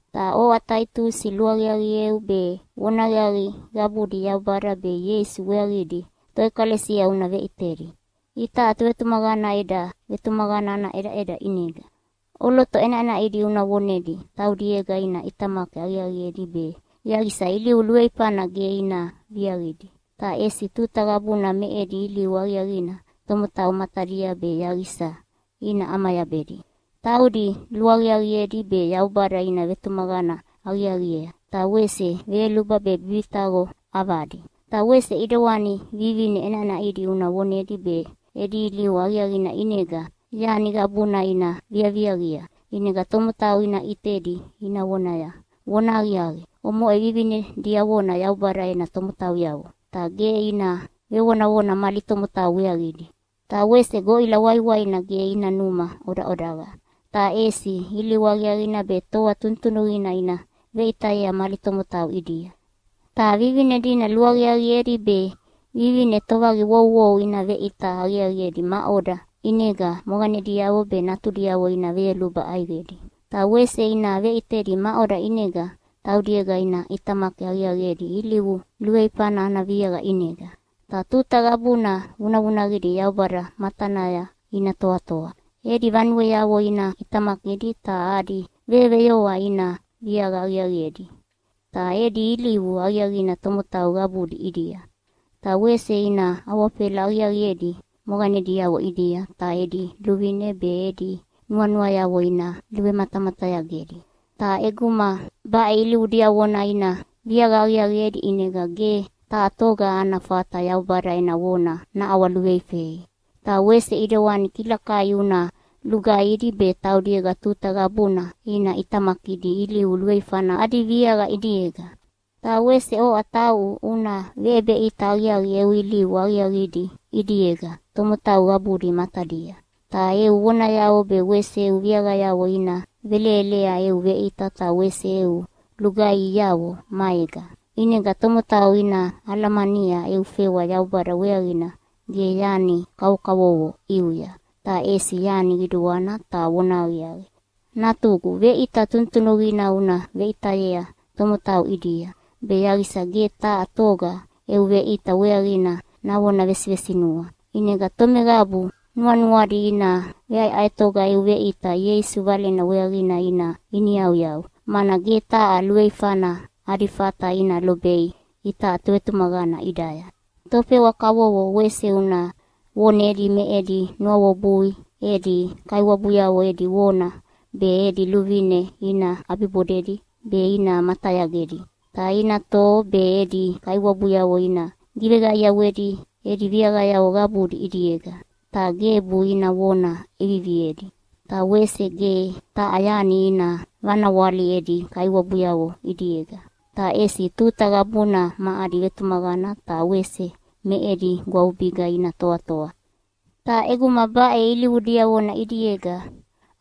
Ta oʼa Taitusi, luaqiaqieu be vonahaqiaqi qabudi Yaubada be Ieisu weaqidi toʼekalesia una veʼitedi, itaʼa tovetumaqana eda vetumaqana ana ʼedaʼeda ʼinega. ʼOloto ʼenaʼenaʼidi una vonedi taudiega ina ʼitamaki aqiaqiedi be yaqisa ilivu luveifana ge ina viaqidi, ta ʼesi tuta qabuna me edi ilivu aqiaqina tomotau matadia be yaqisa ina ʼamayabedi. Taudi luaqiaqiedi be Yaubada ina vetumaqana aqiaqiea, ta wese veyoluba be bibitaqo ʼavadi. Ta wese ʼidewani vivine ʼenaʼenaʼidi una vonedi be edi ilivu aqiaqina ʼinega yani qabuna ina viaviaqia, ʼinega tomotau ina ʼitedi ina vonaya, “Vonahaqiaqi, omoʼe vivine diavona Yaubada ena tomotauyavo!” Ta ge ina vevonavona mali tomotau weaqidi. Ta wese goʼila waiwaina ge ina numa ʼodaʼodaqa, ta ʼesi ilivu aqiaqina be toa tunutunuqina ina veʼitayea mali tomotau ʼidia. Ta vivine dina luaqiaqiedi be vivine tovaqiwouwou ina veʼita aqiaqiedi maʼoda ʼinega moqanediavo be natudiavo ina veyoluba ʼaiqedi. Ta wese ina veʼitedi maʼoda ʼinega taudiega ina ʼitamaki aqiaqiedi ilivu luveifana ana viaqa ʼinega, ta tuta qabuna vunavunaqidi Yaubada matanaya ina toatoa. Edi vanueavo ina ʼitamakidi ta adi veyoveyoa ina viaqa aqiaqiedi, ta edi ilivu aqiaqina tomotau qabudi ʼidia. Ta wese ina awafela aqiaqiedi moqanediavo ʼidia ta edi luvine be edi nuanuayavo ina velumatamatayagedi. Ta ʼeguma baʼe ilivu diavona ina viaqa aqiaqiedi ʼinega ge taha toga ana fata Yaubada ena vona naʼawaluveifei. Ta wese ʼidewani kilakai una lugaihidi be taudiega tuta qabuna ina ʼitamakidi ilivu luveifana adi viaqa ʼidiega. Ta wese oʼa tauʼu una veʼebeʼita aqiaqi eu ilivu aqiaqidi ʼidiega tomotau qabudi matadia. Ta eu vonayavo be wese eu viaqayavo ina velelelea eu veʼita ta wese eu lugaihiavo maega, ʼinega tomotau ina alamania eu fewa Yaubada weaqina ge yani kavokavovo ʼiuya, ta ʼesi yani qiduana ta vonahaqiaqi. Natugu, veʼita tunutunuqina una veʼitayea tomotau ʼidia, be yaqisa ge taha toga eu veʼita weaqina navona vesivesinua. ʼInega tomeqabu nuanuadi ina veʼaeʼaetoga eu veʼita Ieisu Valena weaqina ina iniyauyau, mana ge taha luveifana adi fata ina lobei itaʼa tovetumaqana ʼidaya. Tofewa kavovo wese una vonedi me edi nuawebui edi kaiwabuyavo edi vona be edi luvine ina ʼabibodedi be ina matayagedi. Ta ina toho be edi kaiwabuyavo ina giveqaiawedi edi viaqayavo qabudi ʼidiega. Ta gebu ina vona ʼeviviedi, ta wese ge taha yani ina vanawali edi kaiwabuyavo ʼidiega, ta ʼesi tuta qabuna ma adi vetumaqana ta wese me edi gwavubiga ina toatoa. Ta ʼeguma baʼe ilivu diavona ʼidiega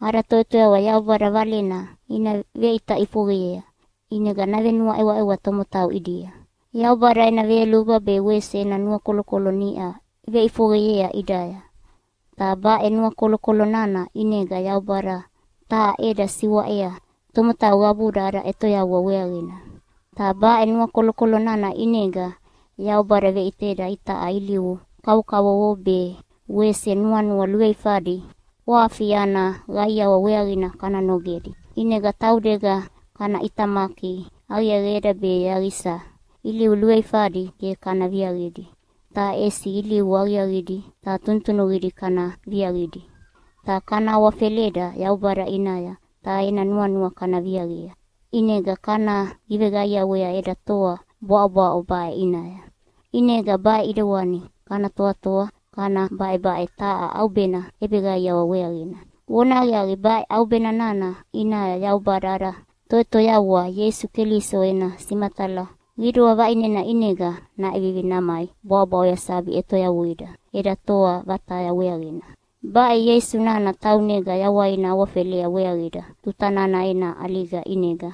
ada Toʼetoyavua Yaubada Valena ina veʼita ʼifoqeyea, ʼinega navenuaʼeweʼewa tomotau ʼidia. Yaubada ena veyoluba be wese ena nuakolokolo niʼa veʼifoqeyea ʼidaya, ta baʼe nuakolokolo nana ʼinega Yaubada taha ʼeda siwaʼea tomotau qabuda ada ʼetoyavua weaqina. Ta baʼe nuakolokolo nana ʼinega Yaubada veʼiteda itaʼa ilivu kavokavovo be wese nuanua luveifadi ʼwafi ana qaiawa weaqina kana nogedi. ʼInega taudega kana ʼitamaki aqiaqieda be yaqisa ilivu luveifadi ge kana viaqidi, ta ʼesi ilivu aqiaqidi ta tunutunuqidi kana viaqidi, ta kana awafeleda Yaubada ʼinaya ta ena nuanua kana viaqia. ʼInega kana giveqaiawea eda toa bwaʼobwaʼo baʼe ʼinaya. ʼInega baʼe ʼidewani kana toatoa kana baʼebaʼe taha ʼaubena ʼebeqaiawa weaqina. Vonahaqiaqi, baʼe ʼaubena nana ʼinaya Yaubada ada Toʼetoyavua Ieisu Keliso ena simatala qidua vaʼinena ʼinega naʼevivi namai bwaʼobwaʼoya sabi ʼetoyavuida eda toa vataya weaqina. Baʼe Ieisu nana taunega yawaina awafelea weaqida tuta nana ena ʼaliga ʼinega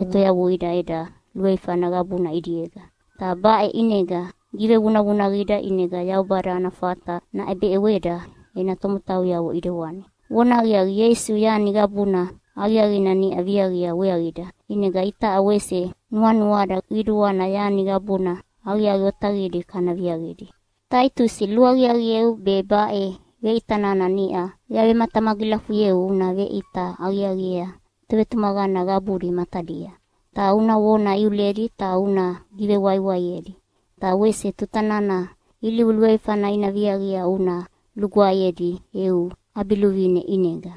ʼetoyavuida eda luveifana qabuna ʼidiega. Ta baʼe ʼinega givevunavunaqida ʼinega Yaubada ana fata naʼebeʼeweda ena tomotauyavo ʼidewani. Vonahaqiaqi, Ieisu yani qabuna aqiaqina niʼa viaqia weaqida, ʼinega itaʼa wese nuanuada qiduana yani qabuna aqiaqi otaqidi kana viaqidi. Taitusi, luaqiaqieu be baʼe veʼita nana niʼa yavematamagilafuyeu una veʼita aqiaqiea tovetumaqana qabudi matadia. Ta una vona iuledi ta una givewaiwaiedi, ta wese tuta nana ilivu luveifana ina viaqia una lugwaeyedi eu ʼabiluvine ʼinega.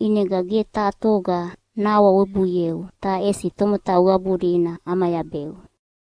ʼInega ge taha toga nahawawebuieu, ta ʼesi tomotau qabudi ina ʼamayabeu.